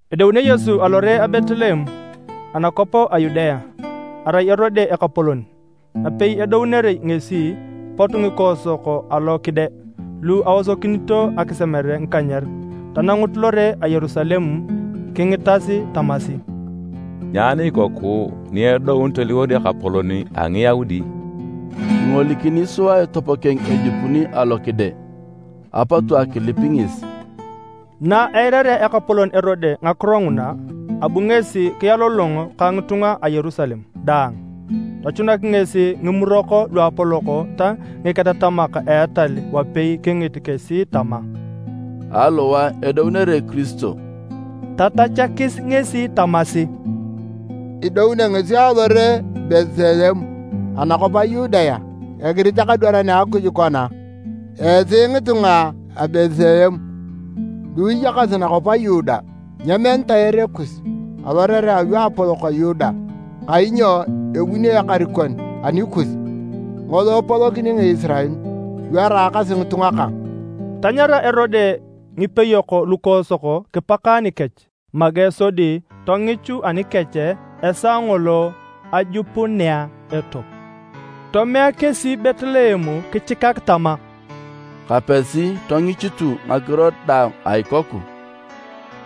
Edounio Yesu alore a Betleem anakwap a Yudea, arai Erode ekapolon. Napei edounere ngesi, pot ngikoosok alo kide lu aosokinito akisemere ngikanyer tanangut lore a Yerusalem. Kingitas tamasi, “Nyaani ikoku ni edoun toliwor Ekapolon a Ngiyaudi? Kingolikini sua etop keng ejupuni alo kide, apotu akilip ngesi.” Na eirarea ekapolon Erode ngakiro nguna abu ngesi kialolongo ka ngitunga a Yerusalem daang. Tochunak ngesi ngimurok luapolok ta ngiketatamak a etal wapei kingit kesi tama, “Aliwae idounere Kiristo?” Tatachakis ngesi tamasi, “Idounio ngesi alore a Betleem anakwap a Yudea. Egirit ekadwaran a Akuj kona: ‘Esi ngitunga a Betleem, lu iyakasi nakwap a Yuda, nyemenitae ere kus alorerea aluapolok a Yuda. Kainyo ebuni ekarikon anikus. Ngolo epolokini Ngisirael lu eraakasi ngitunga kang.’” Tanyara Erode ngipeyok lukoosok kipaka nikech make sodi tongichu anikech esaa ngolo ajupunea etop. Tomea kesi Betleem kichikak tama, “Kapesi tongichutu ngakiro daang a ikoku.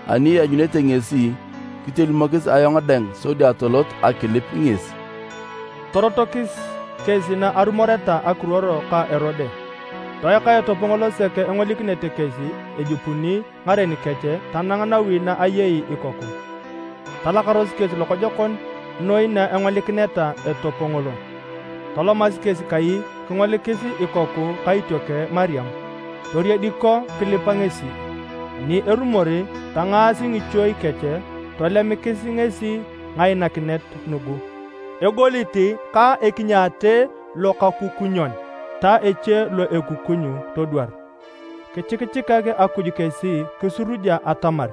Ani ianyunete ngesi kitolimokis ayong dang sodi atolot akilip ngesi.” Torotokis kesi na arumoreta ekiruor ka Erode. Toeka etop ngolo sek engolikinete kesi ejupuni ngaren kech tanang nawi na ayei ikoku. Talakaros kesi lokojokon noi na engolikineta etop ngolo. Tolomasi kesi kai kingolikis ikoku ka itiokeng Mariam. Toriediko kilipa ngesi. Ani erumor, tangaasi ngichuei kech tolemikis ngesi ngainakinet nugu, egolit ka ekinyaate lokakukunyon ta eche lo ekukuny todwar. Kichikichikak Akuj kesi kisuraja atamar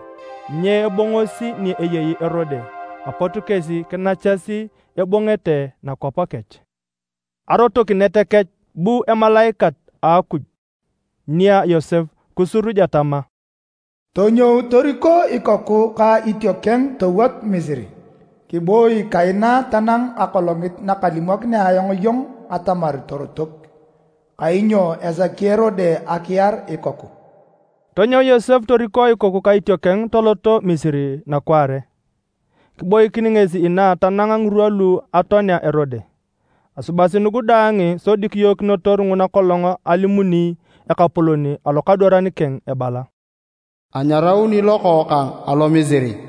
nyeebongosi ni eyei Erode. Apot kesi kinachasi ebongete nakwap kech. Arotokinet kech, bu emalaikat a Akuj nia Yosep kisuruja tama, “Tonyou toriko ikoku ka itiokeng towot Misiri, kiboi kaina tanang akolongit nakalimokinea ayong iyong atamar torotok, kainyo esaki Erode akiar ikoku.” Tonyou Yosep toriko ikoku ka itiokeng tolot Misiri nakwaare. Kiboikin ngesi inaa tanang ngirwa lu atoanea Erode. Asubasi nugu daang sodi kiyookinotor nguna kolong alimuni Ekapolon alokadwaran keng ebala: “Anyarauni Lokookang alo Misiri.”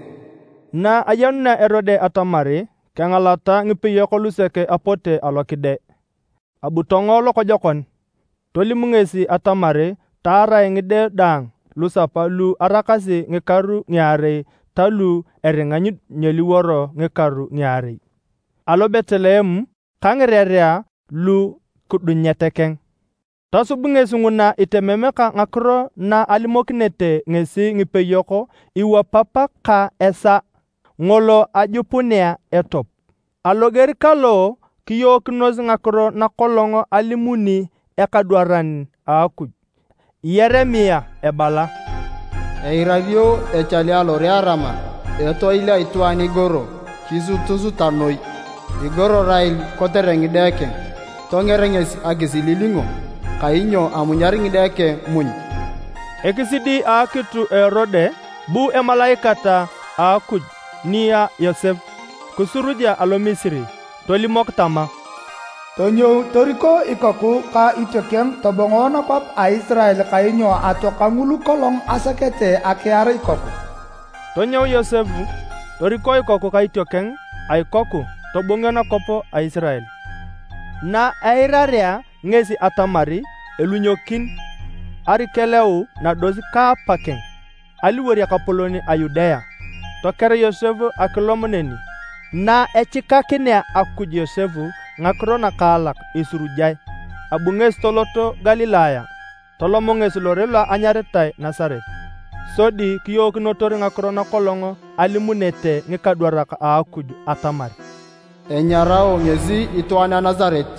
Na ayenunea Erode atamar kengalata ngipeyok lusek apote alo kide, abu tongo lokojokon. Tolim ngesi atamar taarae ngide daang lusapa lu araakasi ngikaru ngiarei ta lu aringa nyeliworo ngikaru ngiarei, alo Betleem ka ngirerea lu kidunyet keng. Tosub ngesi nguna itemem ka ngakiro naalimokinete ngesi ngipeyok iwapap ka esaa ngolo ajupunea etop. Aloger kalo kiyookinos ngakiro nakolong alimuni ekadwaran a Akuj Yeremia ebala: “Eirario echale alore a Rama, etoil a itwaan igoro, kisutusuta noi. Igoro Rael kotere ngide keng. Tonger ngesi akisililingo. Kainyo amunyar ngide keng muny.” Ekisidi a akitu a Erode, bu emalaikat a Akuj nia Yosep kisuruja alo Misiri tolimok tama, “Tonyou toriko ikoku ka itiokeng tobong nakwap a Isirael kainyo atoaka ngulu kolong asakete akiar ikoku.” Tonyou Yosep toriko ikoku ka itiokeng a ikoku tobongio nakwap a Isirael. Na eirarea ngesi atamar elunyokin Arikelau nados ka apa keng aliwor ekapolon a Yudea, toker Yosep akilom neni. Naechikakinea Akuj Yosep ngakiro nakaalak isurujae, abu ngesi tolot Galilaya. Tolom ngesi lore lo anyaritae Nasaret, sodi kiyookinotor ngakiro nakolong alimunete ngikadwarak a Akuj atamar: “Enyarao ngesi itwaan a Nasaret.”